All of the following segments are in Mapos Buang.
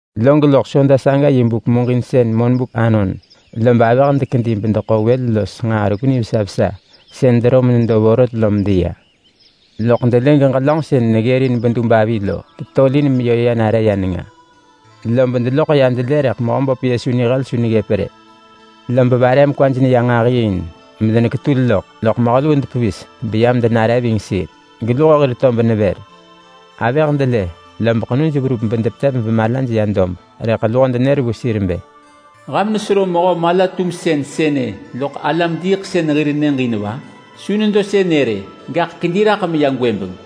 Log loḳ soda saga yi buk muġinsën monbuk anon lob avëh dekedi bedeḳo wël los nġaa reggu nivesa vesa sën dero menedo vorot lo medeya. Loḳ delë geġelönġ sën neggërin bedub avi lo tetolin meyö ya nare ya nenga. Lob deloḳ ya delë rëḳ Mehöböp Yesu nihel su neggëp rë. Lob vare mekwaj neya nġahi in, medeneketul loḳ, loḳ mehö luu depevis beyam denare ving sir geluho hir tob nevër. Avëh delë, lob ḳenuj verup bedepetev bemalaj ya dob. Rëḳ luho denër vu sir bë, “Ham nesero mehö mala-tumsën sënë loḳ alam-diiḳsën hir nyëġ in va? Su nedo sënë rë. Gaḳ kedi raḳ meya gwëbeng!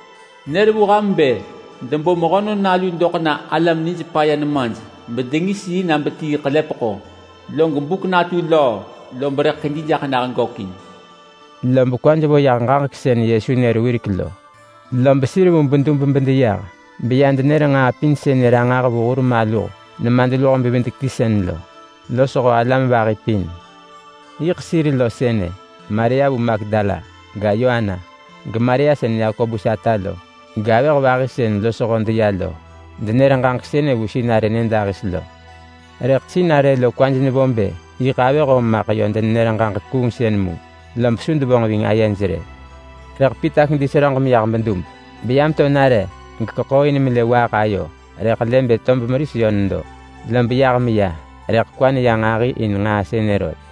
Nër vu ham bë debo Mehönon Nalu doḳ na alam nij paya nemaj bedengis yi na betii ḳelepeḳo, log buk natu löö, lob rëḳ kedi jaḳ nah gökin.” Lob kwaj vo yah ġaġek sën Yesu nër wirek lo. Lob sir vu bedub bedeyah, beya denër nġaa pin sënë ranġah vu hur maluh nemadluho-bevidek-ti sën lo losho alam vahi pin. Yiḳ sir lo sënë: Maria vu Magdala ga, Yoana, geMaria sën Yakobus ata lo, gavëh vahi sën losho deya lo, bedenër ġaġek sënë vu sinarë nyëdahis lo. Rëḳ sinarë lo kwaj nevo bë yiḳ avëh om maḳ yö denenër ġaġek kuungsën mu, lob su devonġ ving ayej rë. Rëḳ Pita kedi seröġ meyah bedub beya meto nare gekeḳooin melë waaḳ ayo, rëḳ lë bë tob meris yö nedo. Lob yah meya rëḳ kwa neya nġahi in nġaa sënë rot.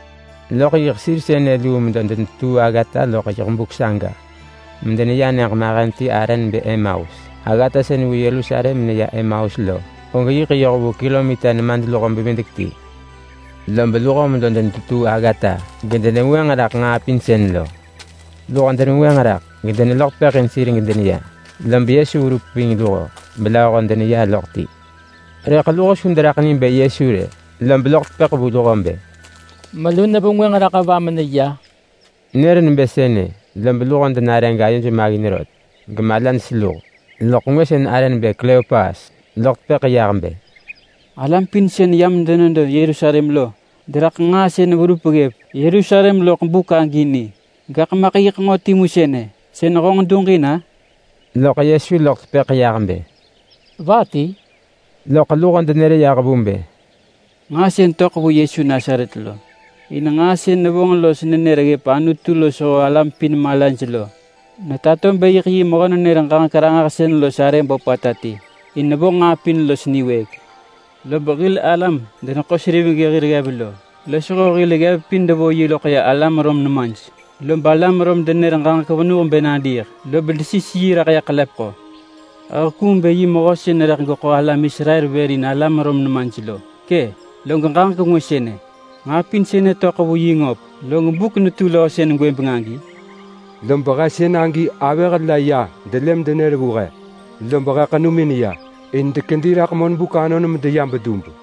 Loḳ yiḳ sir sënë luu medo denetetuu aggata loḳ yiḳ buk saga medeneya nyëġ mahen ti arë nebë Emaus. Aggata sën vu Yerusalem meneya Emaus lo, og yiḳ yoh vu kilomita nemadluho. Lob luho medo denetetuu aggata gedenevengwënġ raḳ nġaa pin sën lo. Luho denevengwënġ raḳ gedeneloḳ tepëḳ in sir gedeneya, lob Yesu verup ving luho, belööho deneya loḳ ti. Rëḳ luho su deraḳ ni bë Yesu rë. Lob loḳ tepëḳ vu luho bë, “Melu nevengwënġ raḳ va meneya?” Nër nebë sënë, lob luho denare gayoj maggin rot, gemalaj seluh. Loḳ ngwë sën arë nebë Kleopas loḳ tepëḳ yah bë, “Alam pin sën yam denedo Yerusalem lo deraḳ nġaa sën verup ggëp Yerusalem loḳ buk agi ni, gaḳ maḳ yiḳ nġo timu sënë sën honġ duġin-a?” Loḳ Yesu loḳ tepëḳ yah bë, “Va ti?” Loḳ luho denër yah vu bë, “Nġaa sën töḳ vu Yesu Nasaret lo. In nġaa sën nevonġ los nenër ggëp Anutu losho alam pin malaj lo netato bë yiḳ yi mehö-nenër-ġaġek-ranġahsën los arë böpata ti, in nevonġ nġaa pin los niwëëk. Lob hil alam-deneḳo-seriveng hir ggev lo, losho hil ggev pin devo yi loḳ ya alam Rom nemaj. Lob alam Rom denër ġaġek venuh bë nadiiḳ, lob desis yi raḳ ya ḳelepeḳo. He hekuung bë yi mehö sën rëḳ geḳo alam Israel vër in alam Rom nemaj lo. Kë’! Log ġaġek ngwë sënë: Nġaa pin sënë töḳ vu yi ngöp, log buk netu löö sën gwëbeng agi, lob he sënagi avëh la ya delë medenër vu he lob he ḳenumin ya. In dekedi raḳ monbuk anon medeya bedub,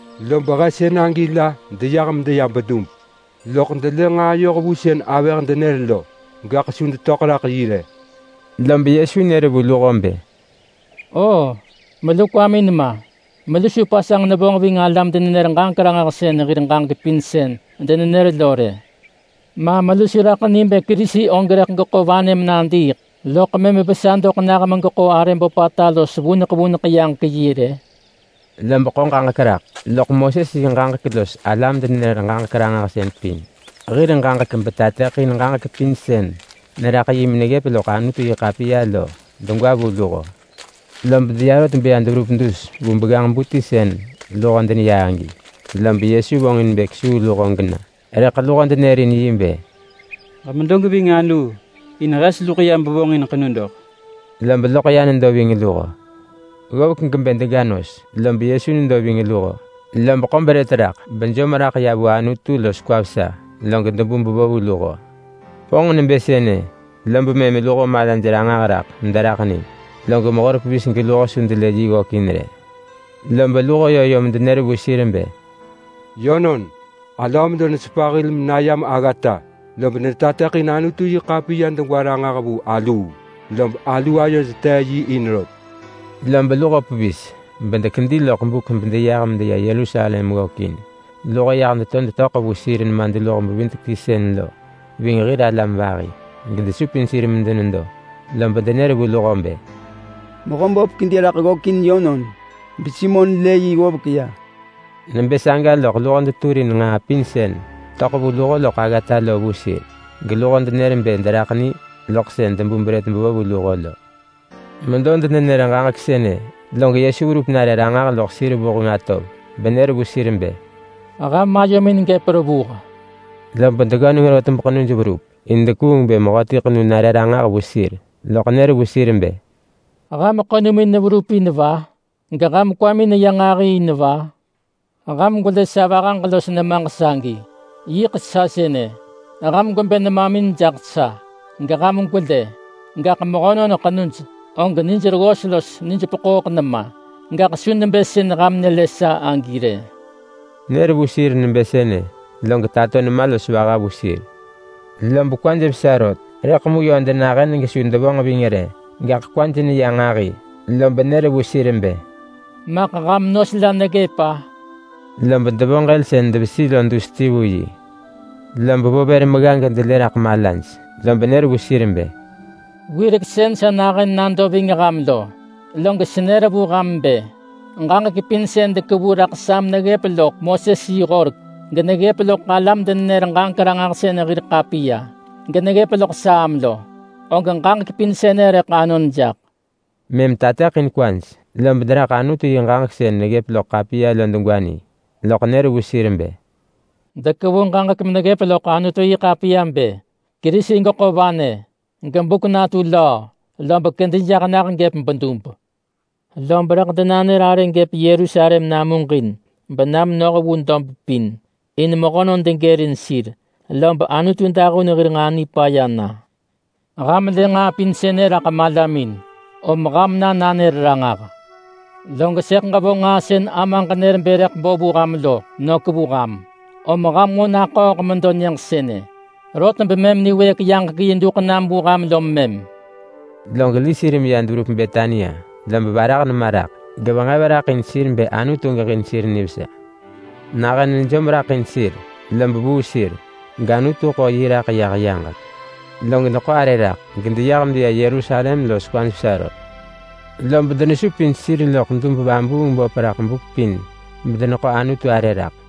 Lob he sënagi la deyah medeya bedub, loḳ delë nġaa yoh vu sën avëh denër lo. Gaḳ su detöḳ raḳ yi rë.” Lob Yesu nër vu luho bë, “Oo, melu kwamin ma! Melu su pasanġ nevonġ ving alam-denenër-ġaġek-ranġahsën hir ġaġek pin sën denenër lo rë. Ma melu su raḳ ni bë Kerisi og rëḳ geḳo vanë menadiiḳ, loḳ mëm vesa doḳ nah megeḳo arë böpata los vuneḳ vuneḳ yaġek yi rë?” Lob ḳo ġaġek raḳ loḳ Moses yi ġaġek los alam-denenër-ġaġek-ranġahsën pin hir ġaġek betateḳin ġaġek pin sën neraḳ yi meneggëp loḳ Anutu-yi-ḳapiya lo degwa vu luho. Lob deya rot beya deverup dus vu begganġ-bu ti sën luho deneya agi, lob Yesu vonġ in bë kesuu luho gena. Rëḳ luho denërin yi bë, “Ġemedo geving aluu in hes luḳ ya bevonġin ḳenu doḳ.” Lob loḳ ya nedo ving luho. Ggovek gebë dega nos, lob Yesu nedo ving luho. Lob ḳo brët raḳ bejom raḳ ya vu Anutu los kwa vesa, log debu bevo vu luho. Vonġ nebë sënë, lob mëm luho malaj ranġah raḳ mederaḳ ni. Log mehor pevis geluho su delë yi ggökin rë. Lob luho yö yom denër vu sir bë, “Yönon, alöö medo nesepa hil menayam aggata, lob netateḳin Anutu-yi-ḳapiya degwa ranġah vu aluu, lob alu ayod tee yi in rot.” Lob luho pevis bedekedi loḳ buk bedeyah medeya Yerusalem ggökin. Luho yah to detöḳ vu sir nemadluho-bevidek-ti sën lo ving hir alam vahi, gedesupin sir medenedo. Lob denër vu luho bë, “Mehöböp kedi raḳ ggökin yönon beSimon lë yi ggovek ya!” Nebë saga loḳ luho deturin nġaa pin sën töḳ vu luho loḳ aggata lo vu sir. Geluho denër bë deraḳ ni loḳ sën debu brët bevo vu luho lo. Medo denenër ġaġek sënë, log Yesu verup nare ranġah loḳ sir vuheng atov [benër vu sir bë, “Ham ayomin gëp revuh.”] Lob deggöneng rot beḳenuj verup. In dekuung bë mehöti ḳenu nare ranġah vu sir. Loḳ nër vu sir bë, “Ham ḳenumin neverup in va? Geham kwamin neya nġahi in va? Ham gwelë sa vahaġ los nemaġ sagi. Yiḳ sa sënë. Ham gwebë nemamin jaḳ sa geham gwelë. Gaḳ mehönon ḳenuj og nijreggos los nijpeḳooḳ nema, gaḳ su nebë sën ham lë sa agi rë. [Nër vu sir nebë sënë, log tato nema los vaha vu sir.] Lob kwaj vesa rot, rëḳ mu yö denahën gesu devonġ ving rë, gaḳ kwaj neya nġahi. Lob nër vu sir bë, “Maḳ ham nos la neggëp-a?” Lob devo ġël sën devesi lo dus ti vu yi. Lob vo vër megga gedelë raḳ malaj. Lob nër vu sir bë, “Wirek sën sa nahën nado ving ham lo, log senër vu ham bë: Ġaġek pin sën dekevu raḳ sa meneggëp loḳ Moses yi horek, geneggëp loḳ alam-denenër-ġaġek-ranġahsën hir ḳapiya, geneggëp loḳ Saam lo, og ġaġek pin sënë rëḳ anon jaḳ.” Mëm tateḳin kwaj, lob deraḳ Anutu yi ġaġek sën neggëp loḳ ḳapiya lo degwa ni. Loḳ nër vu sir bë, “Dekevu ġaġek meneggëp loḳ Anutu-yi-ḳapiya bë: Kerisi geḳo vanë, gebuk natu löö, lob kedi jaḳ nah gëp bedub. Lob rëḳ denanër arë gëp Yerusalem namuġin bena menoh vu dob pin, in mehönon degërin sir, lob Anutu dahun hir nġaa nipaya na. Ham lë nġaa pin sënë raḳ malamin, om ham na nanër ranġah. Log sëḳ ġevonġ nġaa sën Amaġ nër bë rëḳ bo vu ham lo, nök vu ham. Om ham nġo naḳööḳ medo nyëġ sënë, rot bemëm niwëëk yaġek yi duḳ nam vu ham lom mëm.” Log li sir meya deverup Betania. Lob varah nema raḳ, gevenġev raḳ in sir bë Anutu geġin sir nivesa. Nahën nejom raḳ in sir, lob vuu sir, gAnutu ḳo yi raḳ yah yaġek. Log deḳo arë raḳ gedeyah medeya Yerusalem los kwaj vesa rot. Lob denesupin sir loḳ dub-vabuung-böp raḳ buk pin bedeneḳo Anutu arë raḳ.